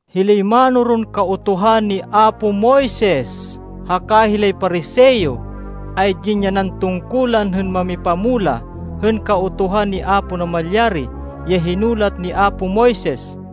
“Hilay mánoron Kautuhan ni apo Moises, haka hilay Pariseo, ay dinyanan tungkulan hên mamipamulah hên Kautuhan ni Apo Namalyari ya hinulat ni apo Moises.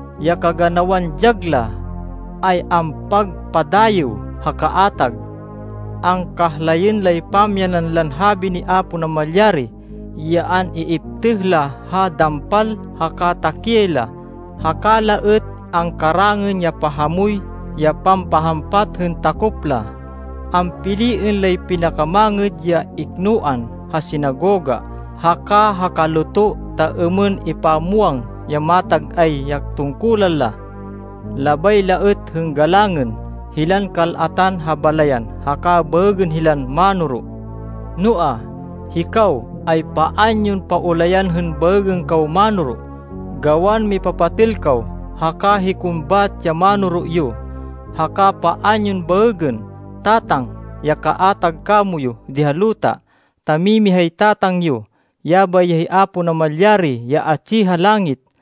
Ya kaganawan dyag la, ay ampagpadayêw ha kaatag. Angkahlayên lay pamyanan lan habi ni Apo Namalyari ya an-iiptêh la ha dampal haka takiyay la, haka la êt angkarangên ya pahamoy ya pampahampat hên takop la. Ampiliên lay pinakamangêd ya iknoan ha sinagoga haka ha kaluto, ta êmên ipamwang ya matag-ay ya tungkulan la. Labay la êt hên galangên, hilan kal-atan ha balayan haka baêgên hilan ‘Mánoro.’ Noa, hikaw, ay paan yon paulayan hên baêgên kaw ‘Mánoro’ gawan mipapatêl kaw, haka hikon bat ya mánoro yo. Haka paan yon baêgên ‘Tatang’ ya kaatag kamoyu di ha luta, ta mimihay Tatang yo, yabay ya hi Apo Namalyari ya atsi ha langit.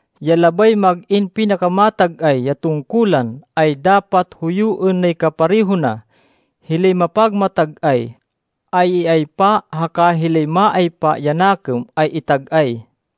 Ya labay mag-in pinakamatag-ay ya tungkulan, ay dapat huyuên nay kapareho na. Hilay mapagmatag-ay, ay iaypa haka hilay maaypa ya nakêm ay itag-ay.”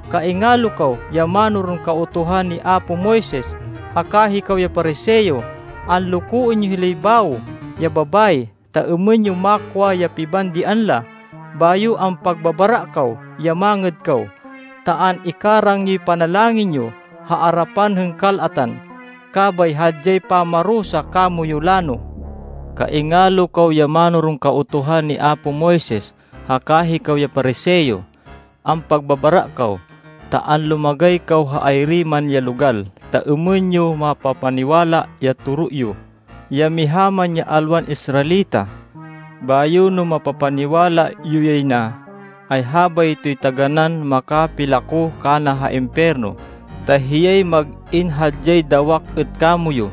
“Kaingalo kaw ya mánoron Kautuhan ni apo Moises haka hikaw ya Pariseo! Anlokoên yo hilay bawo ya babayi, ta êmên yo makwa ya pibandian la, bayo ampagbabara kaw ya mangêd kaw ta an-ikarang yoy panalangin yo ha arapan hên kal-atan. Kabay hadyay pamarusa kamoyu lano. “Kaingalo kaw ya mánoron Kautuhan ni apo Moises haka hikaw ya Pariseo! Ampagbabara kaw! Ta anlumagay kaw ha ay-iri man ya logal, ta êmên yo mapapaniwala ha toro yo, ya miha man ya alwan Israelita. Bayo no mapapaniwala yo yay na, ay habaytoy taganán makapilako kana ha impiyerno, ta hiyay mag-in hadyay dawak êt kamoyu!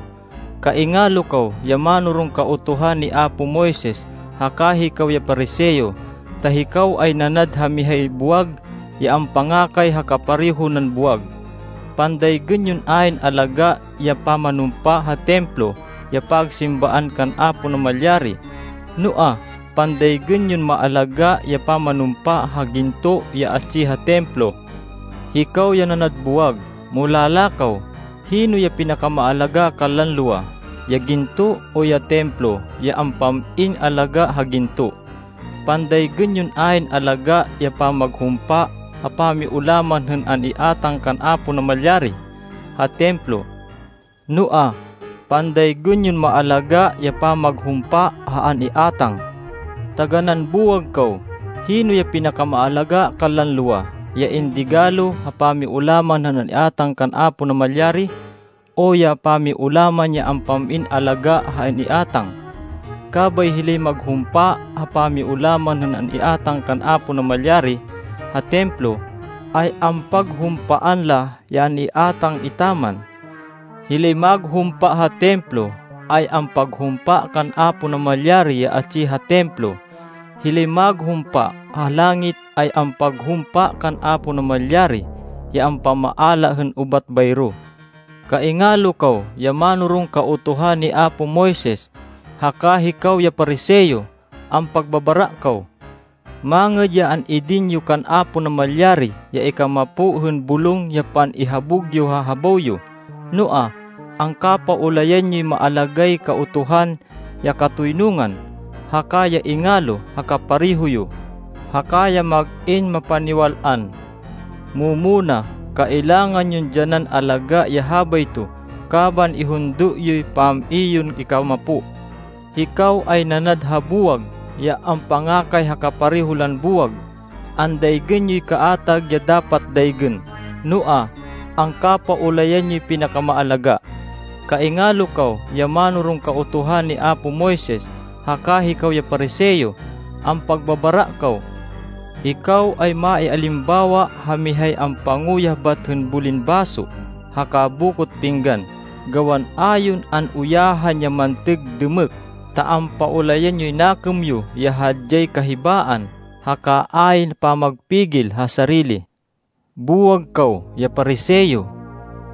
“Kaingalo kaw ya mánoron Kautuhan ni apo Moises haka hikaw ya Pariseo! Ta hikaw ay nanad ha mihay buwag ya ampangakay ha kapareho nan buwag. Pandaygên yon ayn alagá ya pamanumpa ha Templo ya pagsimbaan kan Apo Namalyari. Noa, pandaygên yon maalagá ya pamanumpa ha ginto ya atsi ha Templo! Hikaw ya nanad buwag! Mulala kaw! Hino ya pinakamaalagá kanlan lowa, ya ginto o ya Templo ya ampam-in alagá ha ginto? Pandaygên yon ayn alagá ya pamaghumpa ha pamiulaman hên an-iátang kan Apo Namalyari ha Templo. Noa, pandaygên yon maalagá ya pamaghumpa ha an-iátang. Taganán buwag kaw! Hino ya pinakamaalagá kanlan lowa, ya indigalo ha pamiulaman hên an-iátang kan Apo Namalyari, o ya pamiulaman ya ampam-in alagá ha an-iátang? Kabay hilay maghumpa ha pamiulaman hên an-iátang kan Apo Namalyari ha Templo, ay ampaghumpaan la ya an-iátang etaman. Hilay maghumpa ha Templo, ay ampaghumpa kan Apo Namalyari ya atsi ha Templo. Hilay maghumpa ha langit, ay ampaghumpa kan Apo Namalyari ya ampamaala hên ubat bayro. “Kaingalo kaw ya mánoron Kautuhan ni apo Moises haka hikaw ya Pariseo! Ampagbabara kaw! Mangêd ya an-idin yo kan Apo Namalyari ya ikamapo hên bulong ya pan-ihabug yo ha habaw yo, noa, angkapaulayan yoy maalagáy Kautuhan, ya katoynungan, haka ya ingalo ha kapareho yo, haka ya mag-in mapaniwal-an. Mu-muna kailangan yon dyanan alagá ya habayto kaban ihundo yoy pam-i yon ikamapo. Hikaw ay nanad ha buwag ya ampangakay ha kapareho lan buwag. Andaygên yoy kaatag ya dapat daygên, noa, angkapaulayan yoy pinakamaalagá! “Kaingalo kaw ya mánoron Kautuhan ni apo Moises haka hikaw ya Pariseo! Ampagbabara kaw! Hikaw ay maialimbawa ha mihay ampanguyah bat hên bulin baso haka bokot pinggan, gawan a yon an-uyahan ya mantêg dêmêk, ta ampaulayan yoy nakêm yo, ya hadyay kahibaan, haka ayn pamagpigil ha sarili. Buwag kaw ya Pariseo!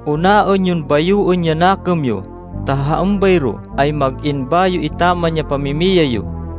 Unaên yon bayoên ya nakêm yo ta ha êmbayro ay mag-in bayo etaman ya pamimiyay yo.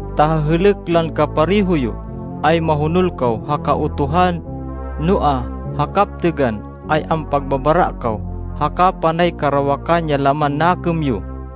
Ta ha hêlêk lan kapareho yo ay mahonol kaw ha Kautuhan, noa, ha kaptêgan, ay ampagbabara kaw, haka panay karawakan ya laman nakêm yo.”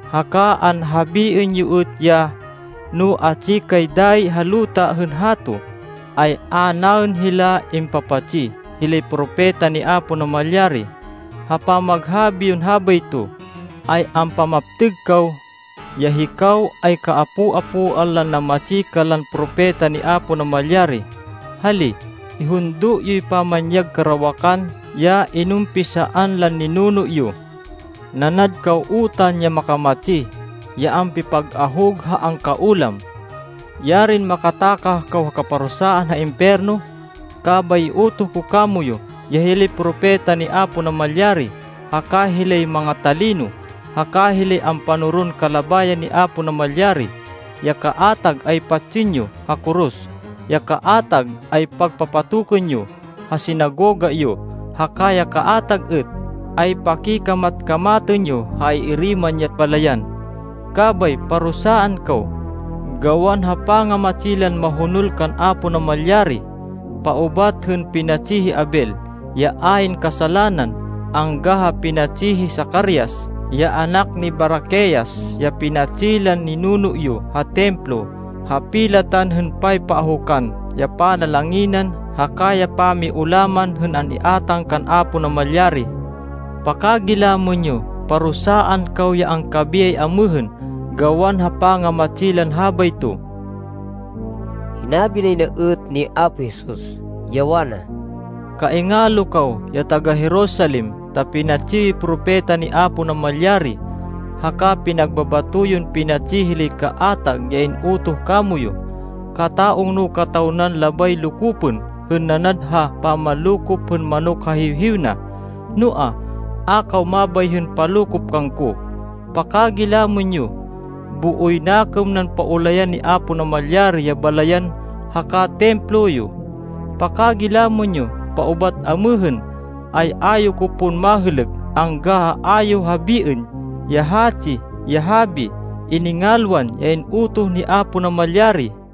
Haka anhabiên yo êt ya, ‘No atsi kay dayi ha luta hên hato, ay a naên hila impapatsi hilay propeta ni Apo Namalyari.’ Ha pamaghabi yon habayto, ay ampamaptêg kaw, ya hikaw ay kaapo-apoan lan nammatsi kanlan propeta ni Apo Namalyari. Hali! Ihundo yoy pamanyag karawakan ya inumpisaan lan ninuno yo! Nanad kaw utan ya makamatsi, ya ampipag-ahug ha angkaulam! Yarin makatakah kaw ha kaparusaan ha impiyerno! Kabay iutoh ko kamoyu ya hilay propeta ni Apo Namalyari, haka hilay manga-talino, haka hilay ampanoron kalabayan ni Apo Namalyari. Ya kaatag ay patsên yo ha koros. Ya kaatag ay pagpapatokên yo ha sinagoga yo, haka ya kaatag êt, ay pakikamat-kamatên yo ha ay-iri man ya balayan. Kabay parusaan kaw, gawan ha pangamatsi lan mahonol kan Apo Namalyari, paubat hên pinatsi hi Abel, ya ayn kasalanan, angga ha pinatsi hi Zacarias ya anak ni Baraquias, ya pinatsi lan ninuno yo ha Templo ha pilatan hên paypaahukan ya panalanginan haka ya pamiulaman hên an-iátang kan Apo Namalyari. Pakagilamên yo, parusaan kaw ya angkabiyay amêhên gawan ha pangamatsi lan habayto.” Hinabi nay na êt ni Apo Jesus, ya wana, “Kaingalo kaw ya taga-Jerusalem, ta pinatsi yoy propeta ni Apo Namalyari, haka pinagbabato yon pinatsi hilay kaatag ya in-utoh kamoyu. Kata-ungno kataw nan labay lokopên hên nanad ha pamanlokop hên manok ha hiwhiw na. Noa, a kaw mabay hên palokop kangko. Pakagilamên yo! Booy nakêm nan paulayan ni Apo Namalyari ya balayan haka Templo yo. Pakagilamên yo! Paubat amêhên, ay a yo ko pon mahêlêk, angga ha a yo habiên ya hatsi ya habi, ‘Iningalwan ya in-utoh ni Apo Namalyari.’”